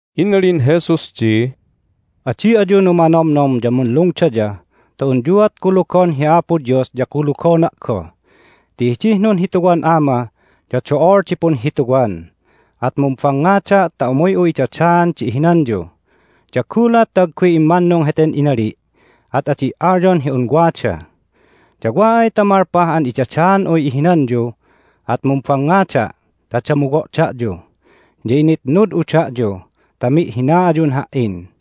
Inalin Jesus di, "Adi ayu numanomnom ya munlungdaya ta unyuat kulugon hi Apo Dios ya kulugona' goh. Ti hidih nunhituwan Ama ya do'ol di punhituwan. At mumbangngada' ta umuy'u idadaan di ihinanyu. Ya gulat ta agguy immannung heten inali' at adi' alyon hi un wada. Ya wa ay ta malpah an idadaan'uy ihinanyu at mumbangngada' ta damuwo' da'yu, ya initnud'u da'yu ta mi'hina ayun Ha"in.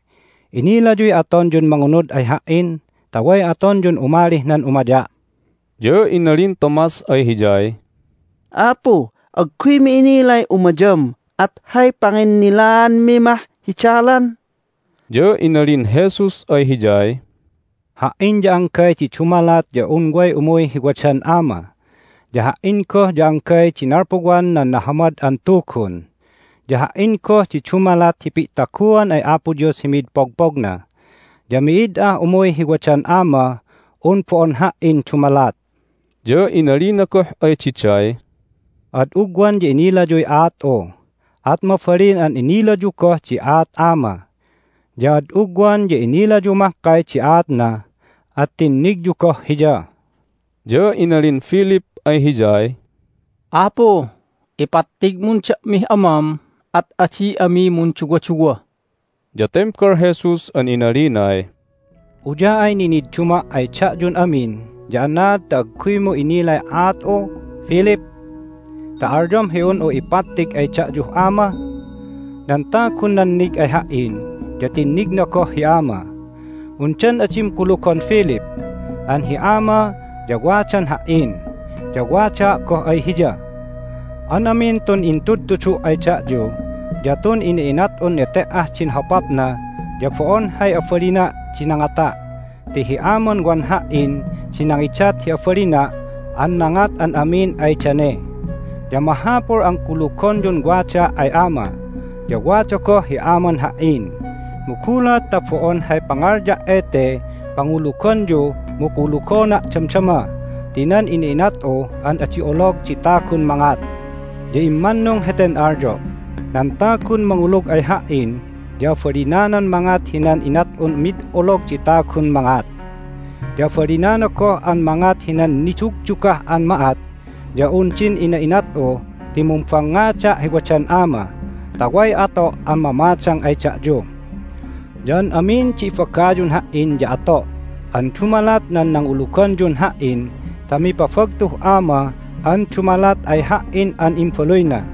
Inilayuy atonyun mangunud ay Ha"in ta way atonyun umalih nan umaya'." Ya inalin Thomas ay Hiyay, "Apu, agguymi inilay umayam, at hay panginnilaanmi mah hi dalan?" Ya inalin Jesus ay hiyay, "Ha"in ya anggay di dumalat ya un way umuy hi wadan Ama. Ya Ha"in goh ya anggay di nalpuwan nan Nahamad an Tugun, ya Ha"in goh di dumalat hi pi'taguan ay Apo Dios hi mid pogpogna. Ya mi'id ah umuy hi wadan Amah un bo'on Ha"in dumalat." Ya inalina goh ay diday, "Ad ugwan ya inilayuy aat'u, at mabalin an inilayu goh di aat Ama. Ya ad ugwan ya inilayu mahkay di aatna, at tinnigyu goh Hiya." Ya inalin Philip ay Hiyay, "Apu, ipattigmun da'mih Amam, at adi ami munduwaduwa." Ya tembal Jesus an inalinay, "Uya'ay ninidduma' ay da'yun amin ya anaad ta agguymu inilay aat'u, Philip, ta alyom hi un'u ipattig ay da'yuh Ama? Nan tagun nannig ay Ha"in ya tinnigna goh hi Ama. Undan adim kulugon, Philip, an hi Ama ya wadan Ha"in, ya wadaa' goh ay Hiya? An amin tun intudtudu' ay da'yu ya tun ina'inat'un nete"ah din hopapna ya bo'on hay abalina' di nangata' ti hi Aman wan Ha"in di nangidat hi abalina' an nangat an amin ay dane. Ya mahapul an kulugonyun wadaa' ay Ama, ya wada goh hi Aman Ha"in. Mu gulat ta bo'on hay pangalya' ete panguluganyu mu kulugona' damdama ti nan ina'inat'u an adi olog di tagun mangat. Ya immannung heten alyo': nan tagun mangulug ay Ha"in ya abalinanan mangat hinan inat'un mid olog di tagun mangat. Ya abalinana goh an mangat hinan nidugdugah an ma'at ya un din ina'inat'u ti mumbangngada' hi wadan Ama, ta way ato' an mamadang ay da'yu. Ya an amin di ibagayun Ha"in ya ato' an dumalat nan nanguluganyun Ha"in ta mipabagtuh Ama an dumalat ay Ha"in an Imbaluyna.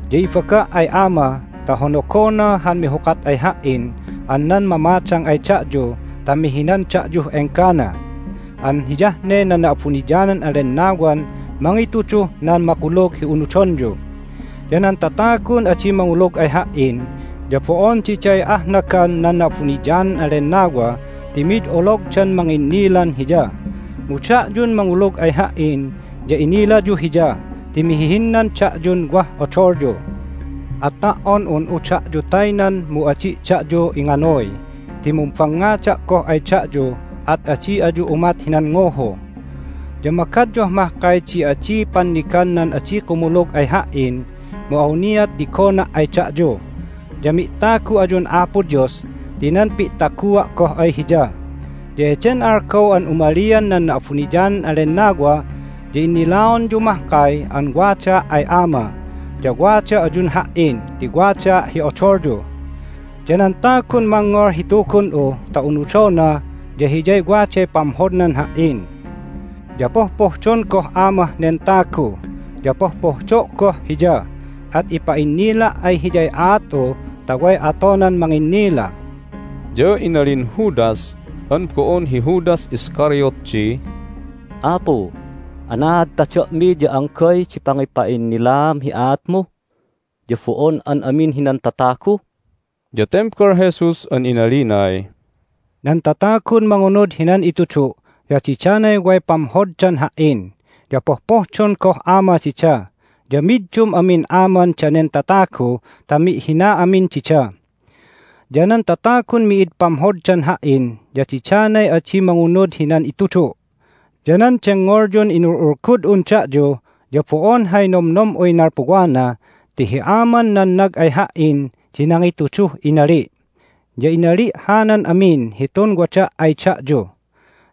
Ya ibaga' ay Ama ta honogona han mihukat ay Ha"in an nan mamadang ay da'yu ta mihinan da'yuh enggana an hiyah ne nan Na'abuniyanan an Lennawan mangituduh nan makulug hi unudonyu. Ya nan tatagun adi mangulug ay Ha"in ya bo'on diday ahnagan nan Na'abuniyanan an Lennawa ti mid ologdan manginnilan Hiya. Mu da'yun mangulug ay Ha"in ya inilayu Hiya ti mihihinnan da'yun wah odolyu. At ta"on un'u da'yu taynan mu adi' da'yu inganuy ti mumbangngada' goh ay da'yu, at adi ayu umat hinan nguhu. Ya magadyuh mahkay di adia' pannigan nan adi kumulug ay Ha"in, mu awniat tigona' ay da'yu, ya mi'tagu ayun Apo Dios ti nan pi'tagua' goh ay Hiya. Ya heden algaw an umalian nan Na'abuniyanan an Lennawa ya innilaonyu mahkay an wadaa' ay Ama, ya wada ayun Ha"in ti wadaa' hi odolyu. Ya nan tagun mangngol hi Tugun'u ta unudona ya hiyay waday pamhodnan Ha"in. Ya pohpohdon goh Amah nen tagu, ya pohpohdo' goh hiya, at ipa'innila' ay hiyay aat'u ta way atonan manginnila." Ya inalin Judas (an bo'on hi Judas Iscariot) di, "Apu, anaad ta da'mi ya anggay di pangipa'innilaam hi aatmu, ya bo'on an amin hinan tatagu?" Ya tembal Jesus an inalinay, "Nan tatagun mangunud hinan itudu' ya didanay way pamhoddan Ha"in. Ya pohpohdon goh Ama dida, ya middum amin Aman danen tatagu ta mi'hina amin dida. Ya nan tatagun mi'id pamhoddan Ha"in ya didanay adi mangunud hinan itudu'. Ya nan dengngolyun inul'ulgud'un da'yu ya bo'on hay nomnom'uy nalpuwana ti hi Aman nannag ay Ha"in di nangituduh inali'. Ya inali' hanan amin hitun wada' ay da'yu.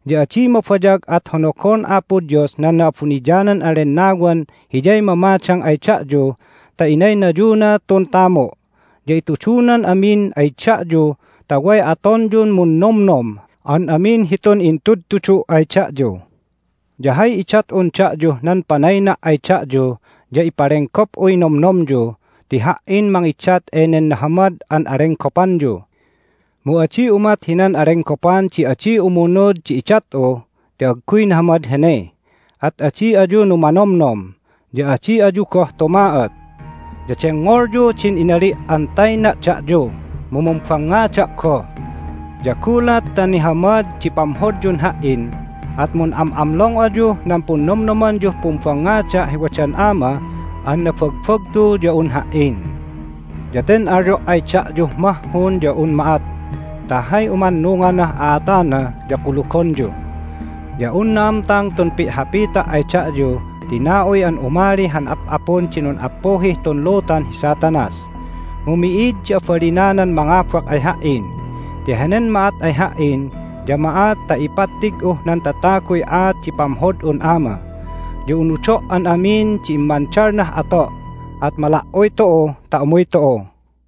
Ya adi mabayag at honogon Apo Dios nan Na'abuniyanan an Lennawan Hiyay mamadang ay da'yu ta inaynayuna tun tamu'. Ya itudunan amin ay da'yu ta way atonyun munnomnom an amin hitun intudtudu' ay da'yu. Ya hay idat'un da'yuh nan panayna' ay da'yu ya ipalenggop'uy nomnomyu ti Ha"in mangidat enen nahamad an alenggopanyu. Mu adi umat hinan alenggopan di adi umunud di idat'u ti agguy nahamad hene. At adi ayu numanomnom, ya adi ayu goh tuma'ot. Ya dengngolyu din inali' an tayna' da'yu, mu mumbangngada' goh. Ya gulat ta nihamad di pamhodyun Ha"in at mun'am'amlong ayuh nan punnomnomanyuh pumbangngada' hi wadan Ama an nabagbagtu ya un Ha"in. Ya ten alyo' ay da'yuh mahhun ya un ma'at ta hay umannunganah a'atana ya kulugonyu. Ya un na'amtang tun pi'hapita' ay da'yu ti na'uy an umali han ap'apun di nun'appuhih tun lutan hi Satanas. Mu mi'id di abalinanan mangabak ay Ha"in ti henen ma'at ay Ha"in ya ma'at ta ipattig'uh nan tataguy aat di pamhod'un Ama. Ya unudo' an amin di immandalnah ato'. At mala"uy tu'u ta umuy tu'u."